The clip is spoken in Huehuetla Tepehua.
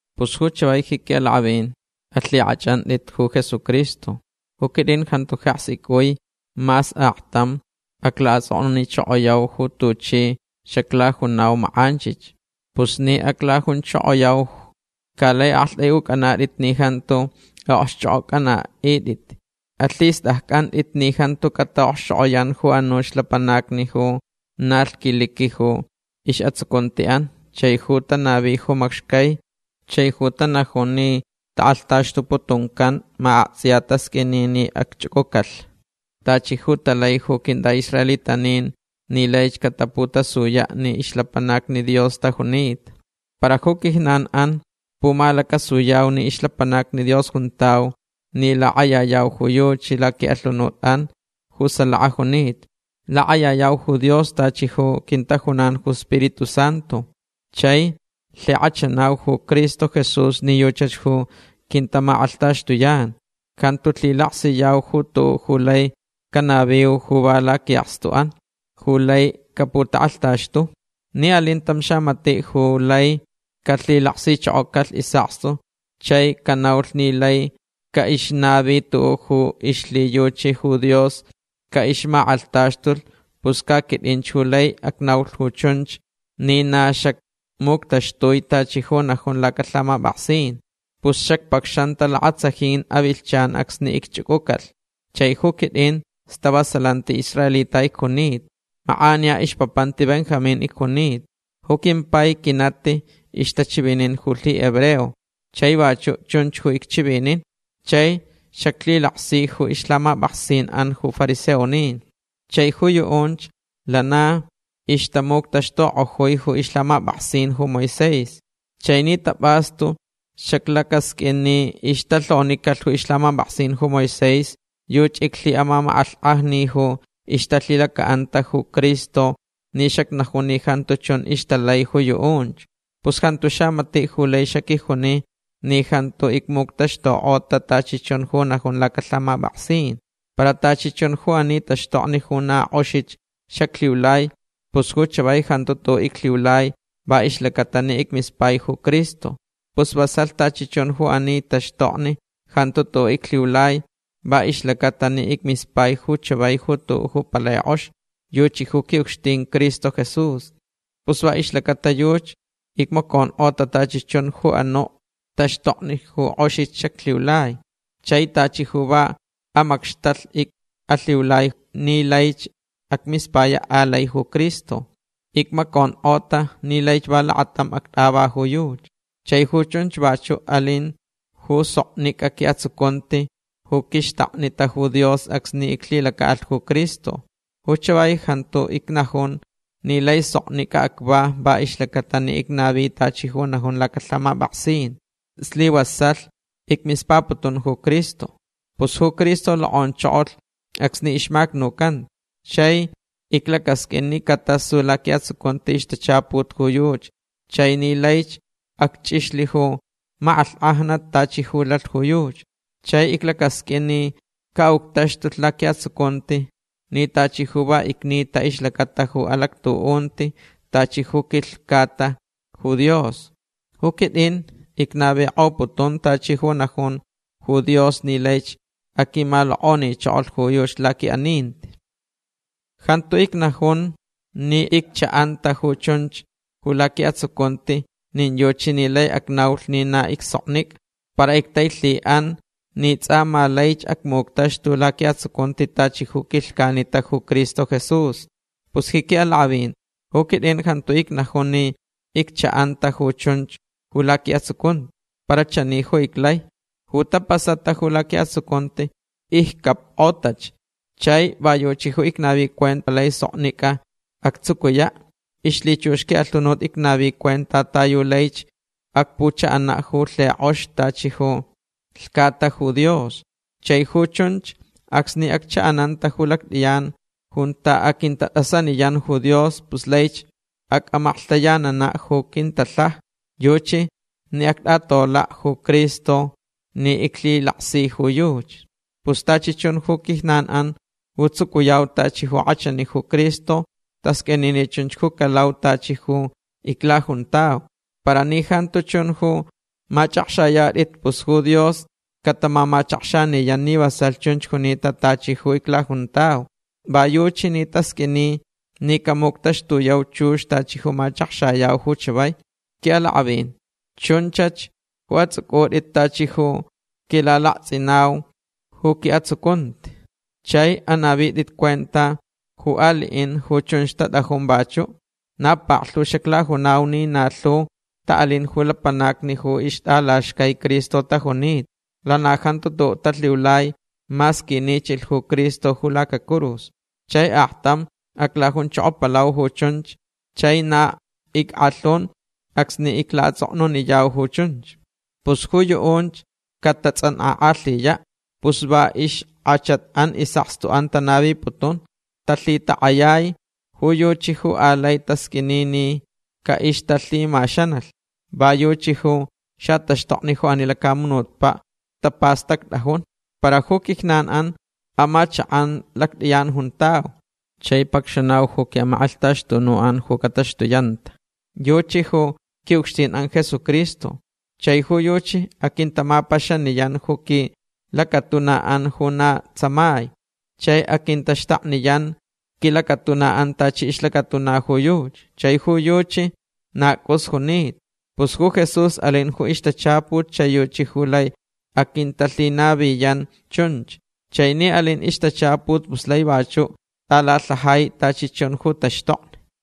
Pus ju chavai ji quiʼalakʼavin alhikʼachʼantʼit ju Jesucristo. Ju quitʼin jantu jeks icʼui mas aktam aclaʼatsʼoknunichokoyau ju tuchi xaclajunau makʼanchich. Pus ni aclajunchokoyau ca laich aktʼaiʼucʼanatʼit ni jantu aʼokxchʼokʼocʼanaʼitʼit. Alhistʼaccʼantʼit ni jantu cataʼokxchokʼoyan ju anuch lapanacni ju na lhquiliqui ju isʼatsucuntiʼan chai ju tanavi ju macxcai chai ju tanajun ni takʼalhtaxtuputuncan ma aktsʼiya tasqʼuini ni acchʼucʼucalh tachi ju talai ju quintʼaʼisraelitanin ni laich cataputasuyaʼ ni ixlapanacni Dios tajunita. Para ju quijnanʼan pumalacasuyau ni ixlapanacni Dios juntau ni lakʼayayau ju yuchi laquiʼalhunutʼan ju salaka junita. Lakʼayayau ju Dios tachi ju quintajunan ju Spiritu Santu. Chai lhikʼachanau ju Cristo Jesús ni yuchach ju quintamakʼalhtaxtuyan. Jantu lhilaksiyau ju tuʼuʼ ju lai canaviu ju va laquiʼakstuʼan ju lai caputakʼalhtaxtu. Ni alin tam xamatiʼ ju laich calhilaksichokocalh isʼakstu chai canaulh ni laich caʼixnavilh tuʼuʼ ju ixlhiyuchi ju Dios caʼixmakʼalhtaxtulh pus ca quitʼinch ju laich acnaulh ju chunch ni na xacmuctaxtui tachi ju najun lacalhamapʼaksin. Pus xacpacxanta lakatsajin avilhchan acsni icchʼucʼucalh. Chai ju quitʼin stavasalanti israelita icjunita. Makʼaniya ixpapanti Benjamín icjunita. Ju quimpai quinati ixtachivinin ju lhihebreo chai vachuʼ chunch ju icchivinin. Chai xaclhilaksi ju ixlhamapʼaksinʼan ju fariseonin. Chai ju yuʼunch lana ixtamuctaxtukʼojui ju ixlhamapʼaksin ju Moisés. Chai ni tapʼastu xaclacasqʼuin ni ixtalhonicalh ju ixlhamapʼaksin ju Moisés yuchi iclhiʼamamakʼalhkʼajni ju ixtalhilacaʼanta ju Cristo ni xacnajun ni jantu chun ixtalai ju yuʼunch. Pus jantu xamatiʼ ju lai xaquijuni ni jantu icmuctaxtukʼota tachi chun ju najun lacalhamapʼaksin. Para tachi chun ju ani taxtokni ju na kʼoxich xaclhiulai pus ju chavai jantu tuʼuʼ iclhiulai va ixlacata ni icmispai ju Cristo. Pus vasalh. Tachi chun ju ani taxtokni jantu tuʼuʼ iclhiulai va ixlacaʼatalh ni icmispai ju chavai ju tuʼuʼ ju palai kʼox. Yuchi ju quiʼucxtin Cristo Jesús. Pus va ixlacata yuchi icmaconkʼota tachi chun ju anuʼ taxtokni ju kʼoxich xaclhiulai. Chai tachi ju va amacxtalh icʼalhiulai ni laich acmispayaʼ alai ju Cristo. Icmaconkʼota ni laich va lakatam actʼava ju yuchi. Chai ju chunch vachuʼ alinch ju soknicʼa quiʼatsucunti ju quixtaknita ju Dios acsni iclhilacaʼalh ju Cristo. Ju chavai jantu icnajun ni lai soknicʼa acva va ixlacata ni icnavi tachi ju najun lacalhamapʼaksin. Slivasalh icmispaputun ju Cristo. Pus ju Cristo lokʼonchokolh acsni ixmacnucanta chai iclacasqʼuin ni catasu laquiʼatsucunti ixtachaput ju yuchi chai ni laich acchʼixlh ju makʼalhkʼajnat tachi ju lalh ju yuchi. Chai iclacasqʼuin ni caʼuctaxtulh laquiʼatsucunti ni tachi ju va icnita ixlacata ju alactuʼunti tachi ju quilhcata ju Dios. Ju quitʼin icnavikʼoputun tachi ju najun ju Dios ni laich aquimalokʼonichokolh ju yuchi laquiʼaninti. Jantu icnajun ni icchaʼanta ju chunch ju laquiʼatsucunti nin yuchi ni lai acnaulh ni na icsoknicʼa. Para ictailhiʼanch ni tsʼa ma laich acmuctaxtu laquiʼatsucunti tachi ju quilhcanita ju Cristo Jesús. Pus ji quiʼalakʼavin ju quitʼin jantu icnajun ni icchaʼanta ju chunch ju laquiʼatsucunti. Para chani ju iclai. Ju tapasata ju laquiʼatsucunti iccapkʼotach. Chai va yuchi ju icnavi cuenta ta yu laich palai soknicʼa actsucuyaʼ. Ixlhichux quiʼalhunut icnavi cuenta ta yu laich acpuchaʼanaʼ ju lhikʼox tachi ju lhcata ju Dios. Chai ju chunch acsni acchaʼananta ju lactʼiyan junta aquintatʼasaniyan ju Dios pus laich acʼamaklhtayananaʼ ju quintalhaja. Yuchi ni actʼatolaʼ ju Cristo ni iclhilaksita ju yuchi. Pus tachi chun ju quijnanʼan ju tsucuyau tachi ju kʼachani ju Cristo tasqʼuini ni chunch ju calau tachi ju iclajuntau. Para ni jantu chun ju machʼakxayatʼit pus ju Dios catamamachakxaniyan ni vasalh chunch junita tachi ju iclajuntau. Va yuchi ni tasqʼuini ni camuctaxtuyau chux tachi ju machakxayau ju chavai. Quiʼalakʼavin chunchach ju atsʼucʼutʼit tachi ju quilalaktsʼinau ju quiʼatsucunti. Chai anavitʼit cuenta ju aliʼin ju chunch tatʼajun vachuʼ. Na paklhu xaclajunau ni na lhu taʼalin ju lapanacni ju ixtʼalaxcai Cristo tajunita. Lana jantu tuʼuʼ talhiulai mas quinichilh ju Cristo ju lacacurus. Chai aktam aclajunchokopalau ju chunch chai na ickʼalhun acsni iclaʼatsʼoknuniyau ju chunch. Pus ju yuʼunch catatsʼankʼakʼalhiyaʼ. Pus va ixkʼachatʼan isʼakstuʼan tanaviputun. Talhitakʼayai ju yuchi ju alai tasqʼuini ni caʼixtalhimaxanalh. Va yuchi ju xataxtokni ju ani lacamunutpaʼ ju tapastactʼajun. Para ju quijnanʼan amachakʼan lactʼiyan juntau. Chai pacxanauch ju quiʼamakʼalhtaxtunuʼan ju cataxtuyanta. Yuchi ju quiʼucxtinʼan Jesucristo. Chai ju yuchi aquintamapaxaniyan ju quilacatunaʼan ju na tsamai. Chai aquintaxtakniyan quilacatunaʼan tachi ixlacatuna ju yuchi. Chai ju yuchi na cʼus junita. Pus ju Jesús alin ju ixtachaput chai yuchi lai aquintalhinaviyan chunch. Chai ni alin ixtachaput pus lai vachuʼ tʼalalhajai tachi chun ju taxtokni.